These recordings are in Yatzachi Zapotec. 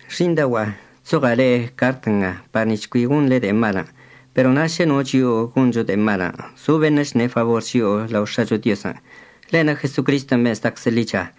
Xi'iṉdaogua'a, chzoɉa' le'e cart nga par nic̱h cui gonḻe de'e malən'. Pero na' šə no chio'o goncho de'e malən', zo beṉə' chṉe' fabor chio'o lao X̱acho Diozən', ḻe'enə' Jesocristən' ben' zdaczə ḻicha.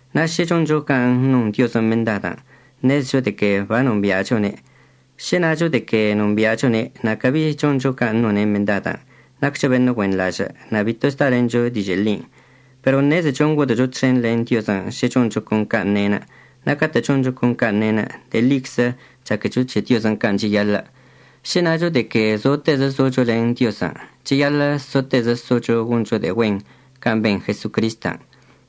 Na' šə choncho can' non Diozən' mendadən' ṉezecho de que banombi'achone'enə'. Šə nacho de que nombi'achone' na' cabi choncho can' none' mendadən', naccho beṉə' güenḻažə' na' bito zdalencho dižə' ḻin'. Pero ṉezecho ngodə'əcho txen len Diozən' šə choncho con can' ne'enə'. Na' catə' choncho con can' ne'enə' de'e ḻiczə chaquecho c̱he' can' cheyaḻə'. Šə nacho de que zotezə zocho len Diozən', cheyaḻə' sotezə socho goncho de'e güen can' ben Jesocristən'.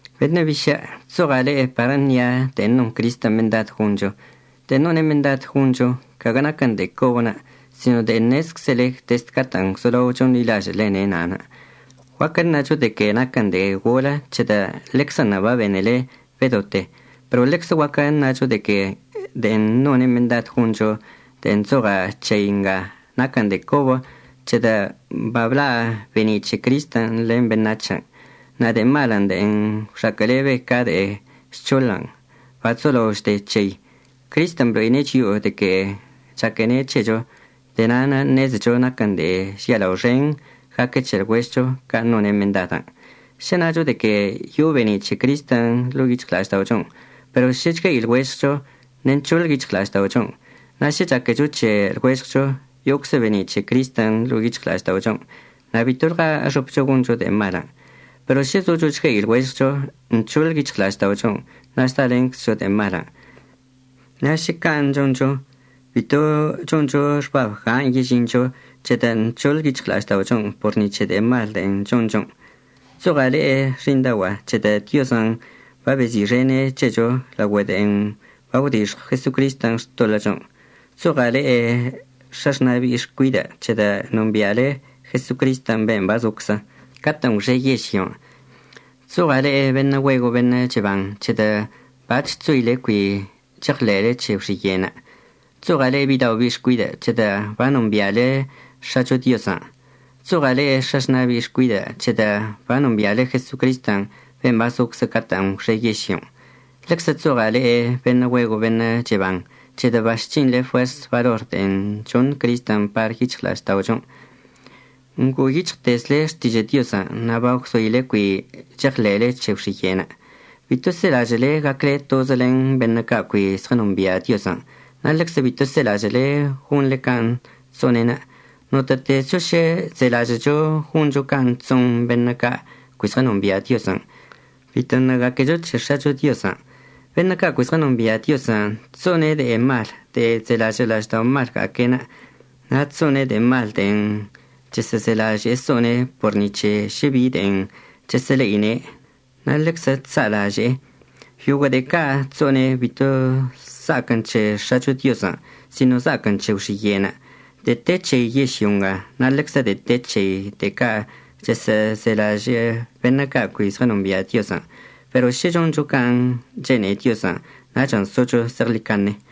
Beṉə' bišə', chzoɉa' le'e par əṉia' de'en non Cristən' mendad goncho. De'en none' mendad goncho caguə naquən de'e cobənə' sino de'e ṉezczele dezd catə'ən gwzolao chonḻilažə'əlene' na'anə'. Guaquə əṉacho de que naquən de'e golə c̱hedə' ḻeczənṉə' babenele bedote. Pero ḻeczə guaquə əṉacho de que de'en none' mendad goncho de'en chzoɉa' c̱hei nga naquən de'e cobə c̱hedə' babla' be'eni' c̱he Cristən' len beṉac̱hən' na' de'e malən' de'en gwxaquə'əlebe ca de'e žc̱hoḻən' bachzolao chde c̱hei. Cristən' blo'ine' chio'o de que chaquene' c̱hecho. De'e na'anə' ṉezecho naquən de'e žialao xen gaque c̱he lɉuežɉcho can' none' mendadən'. Šə nacho de que yo'o be'eni' c̱he Cristən' ḻo'o yic̱hɉla'ažda'ochon' pero šə chgue'i lɉuežɉcho, ṉe'e nc̱hoḻ yic̱hɉla'ažda'ochon'. Na' šə chaquecho c̱he lɉuežɉcho yo'oczə be'eni' c̱he Cristən' ḻo'o yic̱hɉla'ažda'ochon' na' bitolɉa əxopcho goncho de'e malən'. Pero šə zocho chgue'i lɉuežɉcho, nc̱hoḻ yic̱hɉla'ažda'ochon' na' zdalenczcho de'e malən'. Na' šə can' choncho, bito choncho xbab gan' yežincho c̱hedə' nc̱hoḻ yic̱hɉla'ažda'ochon' por ni c̱he de'e mal de'en chonchon'. Chzoɉa' le'e xi'iṉdaogua'a c̱hedə' Diozən' babezi'ixene' c̱hecho laogüe de'en bagwdixɉw Jesocristən' xtoḻə'əchon'. Chzoɉa' le'e x̱axna' bi'i xcuidə' c̱hedə' nombi'ale Jesocristən' ben' bazoczə catə'ən gwxe yežlyon'. Chzoɉa' le'e beṉə' güego' beṉə' cheban c̱hedə' bac̱h gwzoile cui cheɉḻe'ele c̱he gwxiye'enə'. Chzoɉa' le'e bidao' bi'i xcuidə', c̱hedə' banombi'ale X̱acho Diozən'. Chzoɉa' le'e x̱axna' bi'i xcuidə' c̱hedə' banombi'ale Jesocrist ben' bazoczə catə'ən gwxe yežlyon'. Ḻeczə chzoɉa' le'e beṉə' güego' beṉə' cheban c̱hedə' bachc̱hinḻe fuers balor de'en choṉ Cristən' par yic̱hɉla'ažda'ochon'. Ngo'o yic̱hɉtezle Xtižə' Diozən' na' bagwzoile cui cheɉḻe'ele c̱he gwxiye'enə'. Bito selažə'əle gacle tozə len beṉə' ca' cui zɉənombia' Diozən', na' ḻeczə bito selažə'əle gonḻe can' chso'one'enə'. Notə'ətezcho šə chzelažə'əcho goncho can' chso'on beṉə' ca' cui zɉənombia' Diozən', bitoṉə' gaquecho c̱he X̱acho Diozən'. Beṉə' ca' cui zɉənombia' Diozən' chso'one' de'e mal de'en chzelažə' la'ažda'omalga'aque'enə', na' chso'one' de'e mal de'en chəsə'əzelaže'e so'one' por ni c̱he šə bi de'en chəsə'əle'ine', na' ḻeczə chsa'alaže'e. Yoguə' de'e ca' chso'one' bito za'aquən c̱he X̱acho Diozən', sino za'aquən c̱he gwxiye'enə'. De'e te c̱hei yežlyo nga na' ḻeczə de'e te c̱hei de'e ca' chəsə'əzelažə' beṉə' ca' cui zɉənombia' Diozən'. Pero šə choncho can' chene'e Diozən' nachən' socho zeɉḻicaṉe.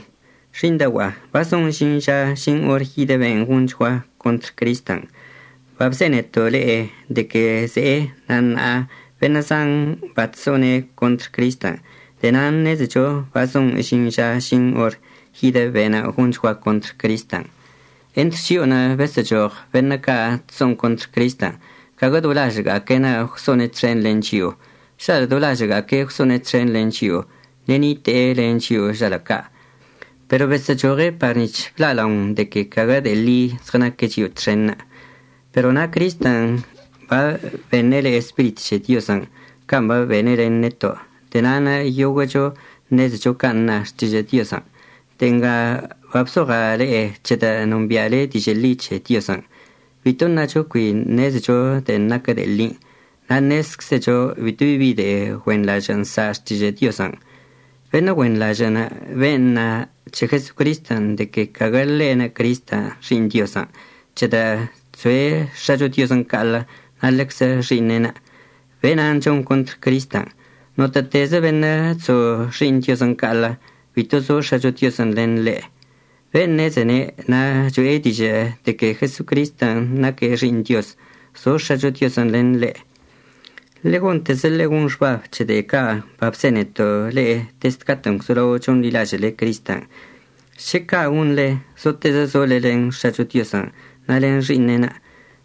Xi'iṉdaogua'a, bazon əžin ža əžin or yidə ben' gonchgua contr Cristən'. Babzeneto' le'e de que ze'e, na' ṉa'a beṉə' zan bachso'one' contr Cristən'. De'e nan' ṉezecho bazon əžin ža əžin or yidə be'enə' gonchgua contr Cristən'. Entr chio'onə' besə'əchoɉ beṉə' ca' chso'on contr Cristən', caguə do lažə'əga'aque'enə' gwso'one' txen len chio'o. Žalə' do lažə'əga'aque' gwso'one' txen len chio'o, ṉe'e nite'e len chio'o žalə' ca'. Pero besə'əchoɉe' par nic̱h bla'alaon de que caguə de'e li zɉənaque' chio'o txenṉə'. Pero na' Cristən' babeṉe' le'e Spirit c̱he Diozən' can' babene' len neto'. De'e na'anə' yoguə'əcho ṉezecho can' na Xtižə' Diozən'. De'e nga babzoɉa' le'e c̱hedə' nombi'ale dižə' ḻi c̱he Diozən'. Bito əṉacho cui ṉezecho de'en naquə de'e ḻin'. Na' ṉezczecho bitobi de'e güenḻažə' nsa' Xtižə' Diozən'. Beṉə' güenḻažə'ənə' ben' na c̱he Jeso'osən' de que caguə ḻe'enə' Cristən' Xi'iṉ Diozən', c̱hedə' chzoe' X̱acho Diozən' ca'aḻə na' len Xi'iṉe'enə'. Be'enan' chon contr Cristən'. Notə'ətezə beṉə' chzo Xi'iṉ Diozən' ca'aḻə, bito zo X̱acho Diozən' len ḻe'. Ben' ṉezene' na' cho'e dižə' de que Jeso'osən' naque' Xi'iṉ Dioz, zo X̱acho Diozən' len ḻe'. Ḻe'e gontezə ḻegon xbab c̱he de'e ca' babzeneto' le'e dezd catə'ən gwzolao chonḻilažə'əle Cristən'. Šə ca' gonḻe, sotezə sole len X̱acho Diozən' na' len Xi'iṉe'enə'.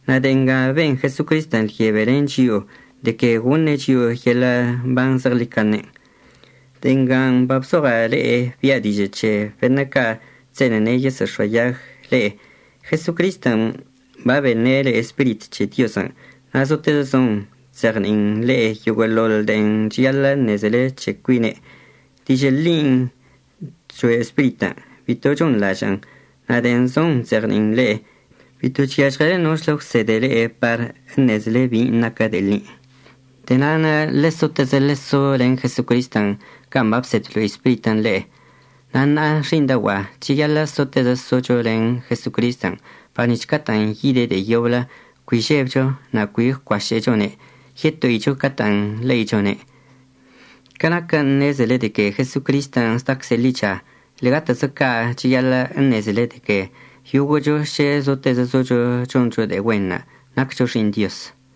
Na' de'e nga ben Jesocristən' lyebe len chio'o, de que goṉe' chio'o yeḻə' mban zeɉḻicaṉen'. De'e ngan' babzoɉa' le'e bi'a dižə' c̱he beṉə' ca' chse'ene'e yesə'əx̱oayag le'e. Jesocristən' babeṉe' le'e Spirit c̱he Diozən' na' zotezə zon chzeɉni'in le'e yoguə'əḻoḻ de'en cheyaḻə' ṉezele c̱he cuine'. Dižə' ḻin' choe' Spiritən', bito chonḻažə'ən. Na' de'en zon chzeɉni'in le'e, bito chyažɉele nochlə gwsede le'e par əṉezele bin' naquə de'e ḻi. De'e na'anə' ḻesotezə ḻeso len Jesocristən' can' babsed bablo'i Spiritən' le'e. Na' ṉa'a xi'iṉdaogua'a, cheyaḻə' sotezə socho len Jesocristən' par nic̱h catə'ən yide' de'e yoblə cui žebcho na' cui gwcuašə'əchone' yeto'icho catə'ən le'ichone'. Ca naquə ṉezele de que Jesocristən' zdacze' ḻicha, ḻe'egatezə ca' cheyaḻə' əṉezele de que yoguə'əcho šə zotezə zocho choncho de'e güen naccho xi'iṉ Dioz.